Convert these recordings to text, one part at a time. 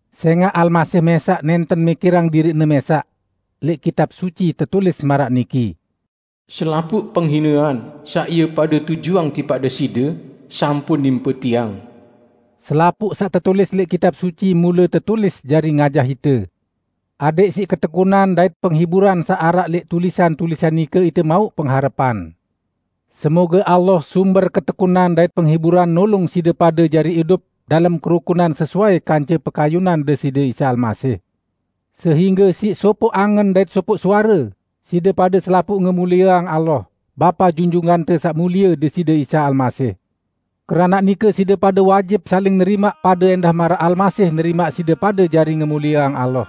Sẽngaq Almasih mẽsaq nẽnten mikirang diriq-Ne mẽsaq. Lẽq Kitab Suci tetulis maraq niki, "Selapuq penghinean saq ie pade tujuang tipaq Deside, sampun nimpe tiang." Selapuq saq tetulis lẽq Kitab Suci mule tetulis jari ngajah ite, adẽq siq ketekunan dait penghiburan saq araq lẽq tulisan-tulisan nike ite mauq pengharepan. Semoge Allah sumber ketekunan dait penghiburan nulung side pade jari idup dalem kerukunan sesuai kance pekayunan Deside Isa Almasih. Sehingge siq sopoq angen dait sopoq suare, side pade selapuq ngemulieang Allah, Bapa Junjungante Saq Mulie Deside Isa Almasih. Keranaq nike side pade wajib saling nerimaq pade ẽndah maraq Almasih nerimaq side pade jari ngemulieang Allah.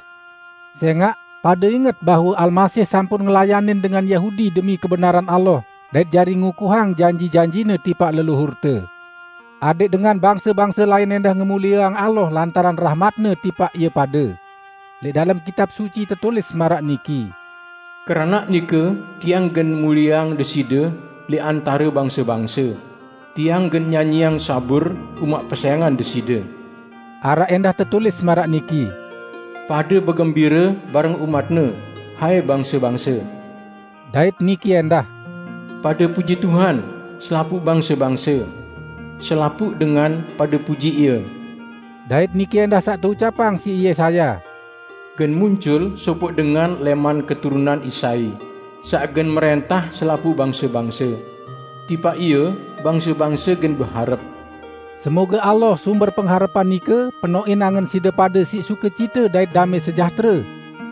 Sẽngaq, pade inget bahwe Almasih sampun ngelayanin dengan Yahudi demi kebenaran Allah dait jari ngukuhang janji-janji-Ne tipaq leluhurte. Adẽq dengan bangse-bangse lain ẽndah ngemulieang Allah lantaran rahmat-Ne tipaq ie pade. Lẽq dalem Kitab Suci tetulis maraq niki, "Keranaq nike tiang gen mulieang Deside lẽq antare bangse-bangse, tiang gen nyanyiang zabur umaq pesẽngan Deside." Araq ẽndah tetulis maraq niki, "Pade begembire bareng umat-Ne, hai bangse-bangse!" Dait niki ẽndah, "Pade puji Tuhan, selapuq bangse-bangse! Selapuq dengan pade puji Ie!" Dait niki ẽndah saq teucapang siq Yesaya, "Gen muncul sopoq dengan lẽman keturunan Isai, saq gen mrẽntah selapuq bangse-bangse; tipaq Ie bangse-bangse gen beharep." Semoge Allah, sumber pengharepan nike, penoqin angen side pade siq sukecite dait damẽ sejahtere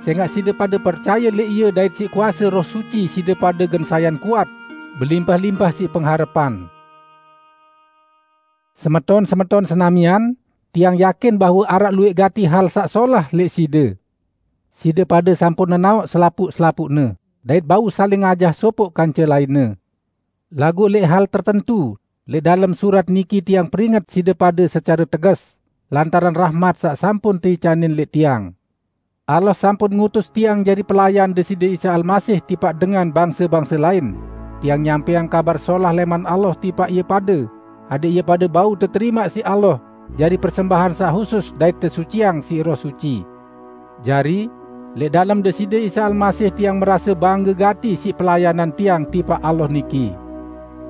sẽngaq side pade percaye lẽq Ie dait siq kuase Roh Suci side pade gen sayan kuat, belimpah-limpah siq pengharepan. Semeton-semeton senamian! Tiang yakin bahwe araq luwẽq gati hal saq solah lẽq side. Side pade sampun nenaoq selapuq-selapuqne dait bau saling ajah sopoq kance lainne. Laguq lẽq hal tertentu, lẽq dalem surat niki tiang peringet side pade secare teges, lantaran rahmat saq sampun teicanin lẽq tiang. Allah sampun ngutus tiang jari pelayan Deside Isa Almasih tipaq dengan bangse-bangse lain, tiang nyampẽang Kabar Solah lẽman Allah tipaq ie pade adẽq ie pade bau teterimaq siq Allah jari persembahan saq husus dait tesuciang siq Roh Suci. Jari, lẽq dalem Deside Isa Almasih tiang merase bangge gati siq pelayanan tiang tipaq Allah niki.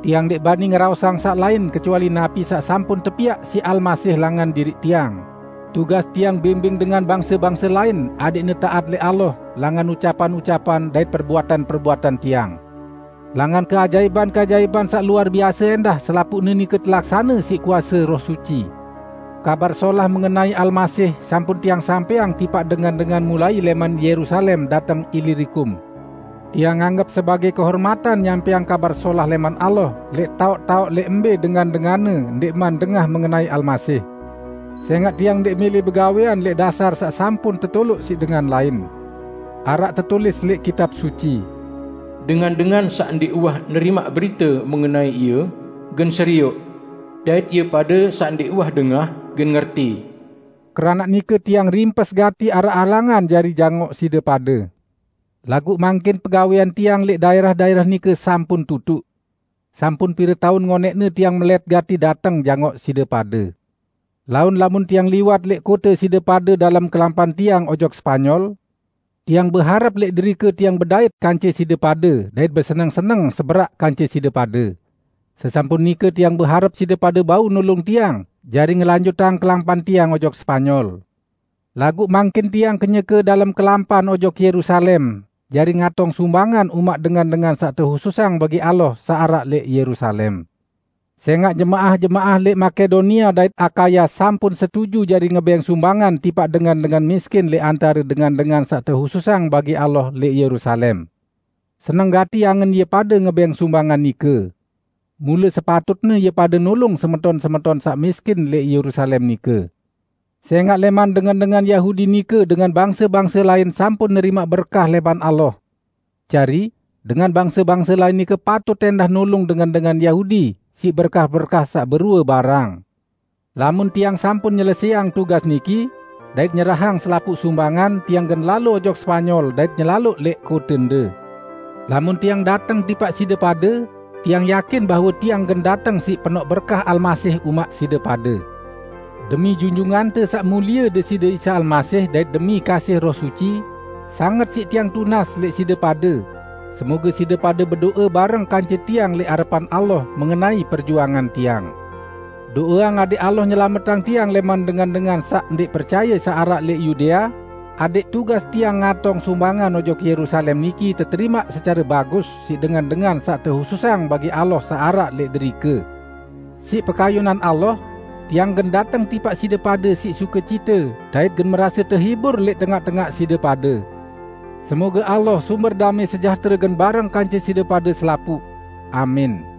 Tiang ndẽq bani ngeraosang saq lain kecuali napi saq sampun tepiaq siq Almasih langan diriq tiang, tugas tiang bimbing dengan bangse-bangse lain adẽqne taat lẽq Allah langan ucapan-ucapan dait perbuatan-perbuatan tiang. Langan keajaipan-keajaipan saq luar biase ẽndah selapuqne nike telaksane siq kuase Roh Suci. Kabar Solah mengenai Almasih sampun tiang sampẽang tipaq dengan-dengan mulai lẽman Yerusalem dateng Ilirikum. Tiang anggep sebagẽ kehormatan nyampẽang Kabar Solah lẽman Allah lẽq taoq-taoq lẽq mbẽ dengan-denganne ndẽqman dengah mengenai Almasih. Sẽngaq tiang ndẽq mẽlẽ begawẽan lẽq dasar saq sampun tetoloq siq dengan lain. Araq tetulis lẽq Kitab Suci, "Dengan-dengan saq ndẽq uwah nerimaq berite mengenai Ie, gen serioq; dait ie pade saq ndẽq uwah dengah, gen ngerti." Keranaq nike tiang rimpes gati araq halangan jari jangoq side pade. Laguq mangkin pegawẽan tiang lẽq daẽrah-daẽrah nike sampun tutuq. Sampun pire taun ngonẽqne tiang melẽt gati dateng jangoq side pade. Laun lamun tiang liwat lẽq kote side pade dalem kelampan tiang ojok Spanyol, tiang beharep lẽq derike tiang bedait kance side pade dait beseneng-seneng seberaq kance side pade. Sesampun nike tiang beharep side pade bau nulung tiang jari ngelanjutang kelampan tiang ojok Spanyol. Laguq mangkin tiang kenyeke dalem kelampan ojok Yerusalem jari ngatong sumbangan umaq dengan-dengan saq tehususang bagi Allah saq araq lẽq Yerusalem. Sẽngaq jemaah-jemaah lẽq Makedonia dait Akaya sampun setuju jari ngebẽng sumbangan tipaq dengan-dengan miskin lẽq antare dengan-dengan saq tehususang bagi Allah, lẽq Yerusalem. Seneng gati angen ie pade ngebẽng sumbangan nike. Mule sepatutne ie pade nulung semeton-semeton saq miskin lẽq Yerusalem nike; sẽngaq lẽman dengan-dengan Yahudi nike dengan bangse-bangse lain sampun nerimaq berkah lẽman Allah. Jari, dengan bangse-bangse lain nike patut ẽndah nulung dengan-dengan Yahudi siq berkah-berkah saq berue barang. Lamun tiang sampun nyelesẽang tugas niki, dait nyerahang selapuq sumbangan, tiang gen lalo ojok Spanyol dait nyelaloq lẽq kotende. Lamun tiang dateng tipaq side pade, tiang yakin bahwe tiang gen dateng siq penoq berkah Almasih umaq side pade. Demi Junjungante Saq Mulie Deside Isa Almasih dait demi kasih Roh Suci, sanget siq tiang tunas lẽq side pade, semoge side pade bedo'e bareng kance tiang lẽq arepan Allah mengenai perjuangan tiang. Do'eang adẽq Allah nyelametang tiang lẽman dengan-dengan saq ndẽq percaye saq araq lẽq Yudea, adẽq tugas tiang ngatong sumbangan ojok Yerusalem niki teterimaq secare bagus siq dengan-dengan saq tehususang bagi Allah saq araq lẽq derike. Siq pekayunan Allah, tiang gen dateng tipaq side pade siq sukecite dait gen merase tehibur lẽq tengaq-tengaq side pade. Semoge Allah, sumber damẽ sejahtere gen bareng kance side pade selapuq! Amin.